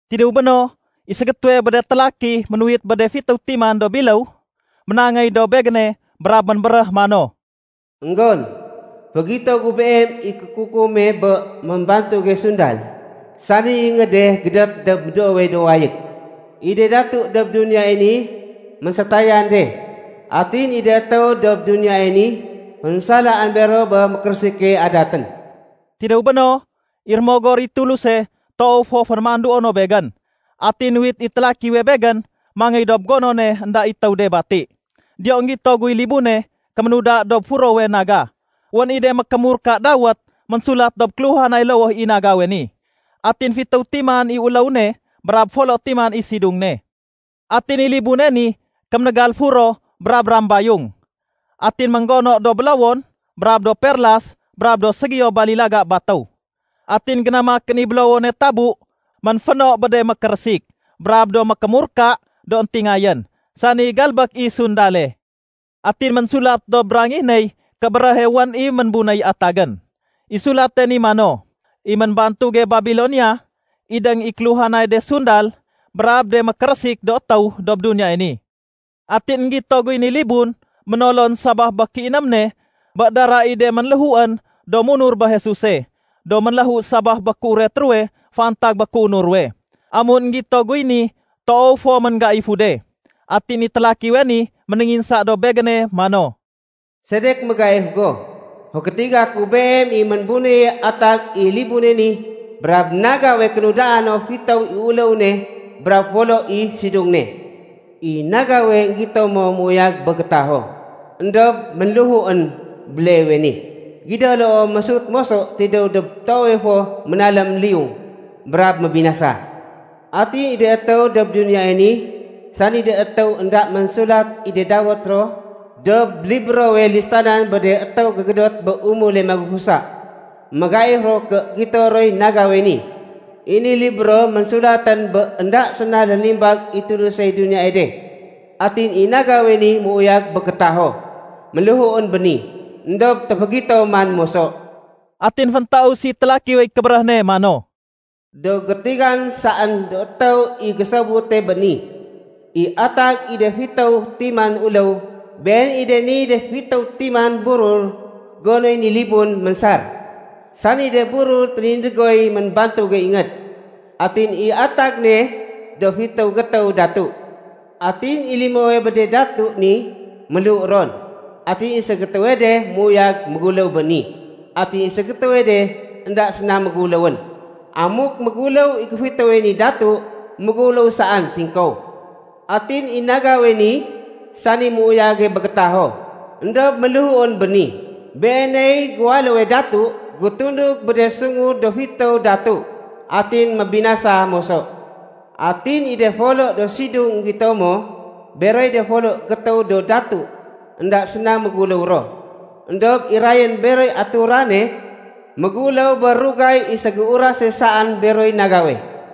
Tidéw béno, i ségétéwe bé de télaki ménuwit bé de fitéw timan do biléw, ménangéy dob begéne brab ménbéréh mano, “Enggon, fégito gu beem i kékukume bé ménbantuge sundal, sani ingéde gédét dob médoowe do wayég. I de datu dob duniyae ni ménsétayan de. Atin i de étéw dob duniyae ni, fénsalaén bero bé mékérésike adatén.” Tidéw béno, i Rémogor i Tuluse toow fo fénémanduo no begén, atin nuwit i télakiwe begén mangéy dob gonone énda i étéw de bati. Diyo énggito guy libune kéménuda dob furowe naga. Wén i de mékémurka dawét ménsulat dob kéluhanay lowoh i nagawe ni. Atin fitéw timan i uléw ne brab folo timan i sidung ne. Atin i libune ni kéménégal furo brab rambayung. Atin ménggono do bélowon brab do perlas brab do ségiyo balilaga batéw. Atin génamakén i bélowone tabu ménféno bé de mékérésik brab do mékémurka do éntingayén, sani galbék i sundale. Atin ménsulat dob rangih ney kébéréhe wén i ménbunéy atagén. I sulate ni mano, “I ménbantuge Babilonia, idéng i kéluhanay de sundal brab de mékérésik do étéw dob duniyae ni.” Atin énggito guy ni libun ménolon sabaf bé kéiném ne bé dara i de ménléhuén do munur bé Jesuse do ménléhu sabaf bé kéuret ruwe fantag bé kéunur ruwe. Amun énggito guy ni, toow fo ménggaifu de. Atin i télakiwe ni ménénginsa dob begéne mano, “Sedek mégaif go? Fégétiga ku beem i ménbunéye atag i libune ni brab nagawe kénudaa no fitéw i uléw ne brab folo i sidung ne. I nagawe énggito mo méuyag bé gétaho, éndob ménléhuén béleewe ni. Gido loo, mésut moso tidéw dob toowe fo ménalém liyung brab mébinasa. Atin i de étéw dob duniyae ni, sani de étéw énda ménsulat i de dawét ro dob librowe listanan bé de étéw gégédot bé umule magufusa, mégaif ro ké gito roy nagawe ni. I ni libro ménsulatén bé énda séna lénimbag i Tulusey duniyae de. Atin i nagawe ni méuyag bé gétaho, ménléhuén béni. Endob téfégito man moso.” Atin féntaus i télakiwey kébéréh ne mano, “Do gétigan saén do étéw i gésobute bé ni: I atag i de fitéw timan uléw, been i de niy de fitéw timan burur gonoy ni libun mésar, sani de burur ténindégoy ménbantuge ingéd. Atin i atag ne do fitéw gétéw datu. Atin i limowe bé de datu ni ménléhu ron. Atin i ségétéwe de méuyag méguléw béni. Atin i ségétéwe de énda séna méguléwén. Amuk méguléw i géfitéwe ni datu, méguléw saén singkow. Atin i nagawe ni, sani méuyage bé gétaho éndob ménléhuén béni, beeney géwaléwe datu gétundug bé de sungu do fitéw datu atin mébinasa moso. “Atin i de folo do sidung énggito mo, beroy de folo gétéw do datu énda séna méguléw ro. Endob irayén beroy aturane méguléw bé rugay i ségéurase saén beroy nagawe.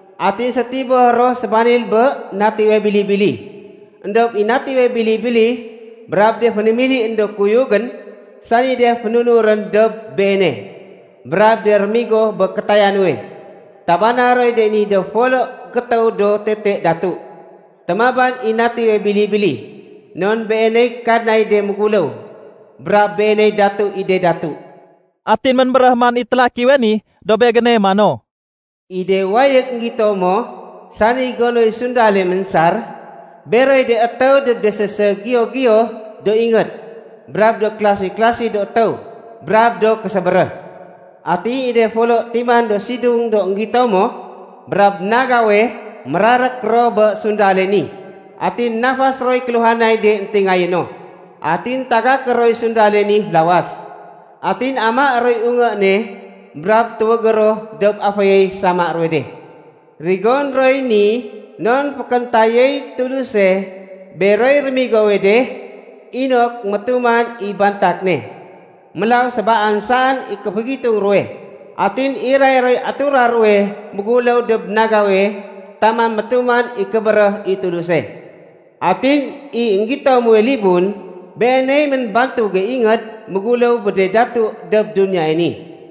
Atin sétiboh ro sébanil bé Natiwe Bili-bili. Endob i Natiwe Bili-bili brab de fénémilién do kuyugén sani de fénunurén dob Beene brab de rémigo bé kétaya nuwe, tabana roy de ni do folo gétéw do tete datu. Témaban i Natiwe Bili-bili non Beeney Kadnay de méguléw brab Beeney Datu i de datu.” Atin ménbéréh man i télakiwe ni dob begéne mano, “I de wayég énggito mo, sani gonoy sundale ménsar, beroy de étéw dob de séségiyo-giyo do ingéd brab do kélasi-klasi do étéw brab do késébéréh. Atin i de folo timan do sidung do énggito mo, brab nagawe, mérarék ro bé sundale ni. Atin nafas roy kéluhanay de éntingayé no. Atin tagaké roy sundale ni félawas. Atin amaé roy ungé ne brab tuwégé ro dob aféyey sama ruwe de. Rigoné roy ni non fékéntayéy Tuluse beroy rémigowe de inok métuman i bantak ne. Mélaw sébaan saén i kéfégitung ruwe, atin iray roy atura ruwe méguléw dob nagawe taman métuman i kébéréh i Tuluse. “Atin i énggito muwe libun, beeney ménbantuge ingéd méguléw bé de datu dob duniyae ni.”